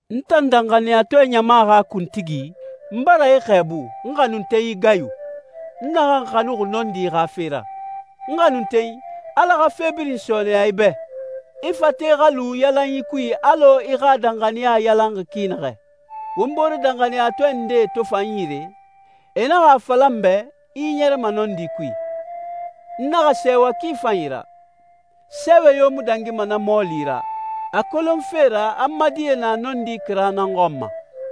N tan danxaniyatɔɛ ɲama xa kuntigi, n bara i xɛɛbu, n xanuntenyi Gayu, n naxan xanuxi nɔndi xa fe ra. N xanuntenyi, Ala xa fe birin sɔɔnɛya i bɛ. I fate xa lu yalanyi kui alɔ i xa danxaniya yalanxi ki naxɛ. Won boore danxaniyatɔɛ ndee to fa n yire, e naxa a fala n bɛ i ɲɛrɛma nɔndi kui. N naxa sɛɛwa ki fanyi ra. Sɛɛwɛ yo mu dangima na mɔɔli ra, a kolonfe ra a n ma die na nɔndi kira nan xɔn ma.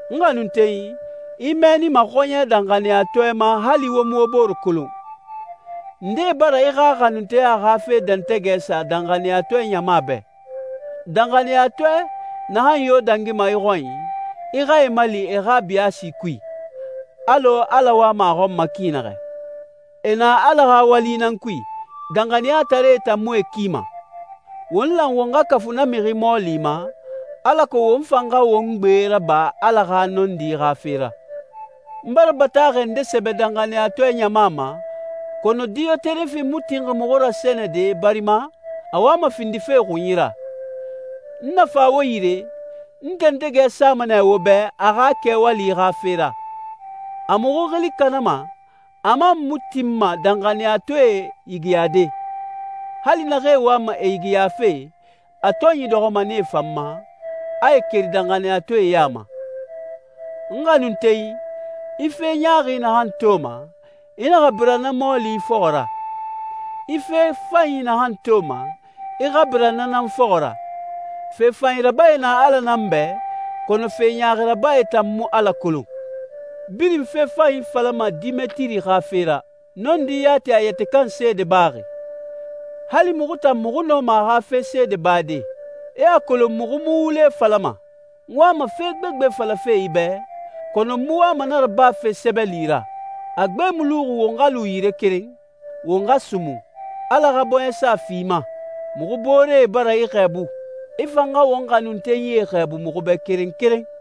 N xanuntenyi, i mɛɛnima xɔɲɛ danxaniyatɔɛe ma hali wo mu wo bore kolon. Ndee bara i xa xanunteya xa fe dɛntɛgɛ sa danxaniyatɔɛ ɲama bɛ. Danxaniyatɔɛ naxan yo dangima i xɔnyi, i xa e mali e xa biyaasi kui, alɔ Ala wama a xɔn ma ki naxɛ. E na Ala xa wali nan kui, danxaniyataree tan mu e kima. Won lan won xa kafu na mixi mɔɔli ma, alako won fan xa won gbe raba Ala xa nɔndi xa fe ra. N bara bataaxɛ nde sɛbɛ danxaniyatɔɛ ɲama ma, kɔnɔ Diyoterefi mu tinxi muxu rasɛnɛde barima a wama findife xunyi ra. N na fa wo yire, n dɛntɛgɛ sama nɛ wo bɛ a xa kɛwali xa fe ra. A muxu xili kanama, a man mu tinma danxaniyatɔɛe yigiyade. Hali naxee wama e yigiyafe, a tɔnyi dɔxɔma nee fan ma, a e keri danxaniyatɔɛe ya ma. N xanuntenyi, i fe ɲaaxi naxan toma, i naxa bira na mɔɔli fɔxɔ ra. I fe fanyi naxan toma, i xa bira na nan fɔxɔ ra. Fe fanyi rabae na Ala nan bɛ, kɔnɔ fe ɲaaxi rabae tan mu Ala kolon. Birin fe fanyi falama Demetiri xa fe ra. Nɔndi yati a yɛtɛ kan seede baxi. Hali muxu tan muxu nɔma a xa fe seede bade. I a kolon muxu mu wule falama. N wama fe gbegbe falafe i bɛ, kɔnɔ n mu wama na rabafe sɛbɛli ra. A gbe mu luxi won xa lu yire keren, won xa sumun. Ala xa bɔɲɛsa fi i ma. Muxu booree bara i xɛɛbu. I fan xa won xanuntenyie xɛɛbu muxu bɛ keren keren.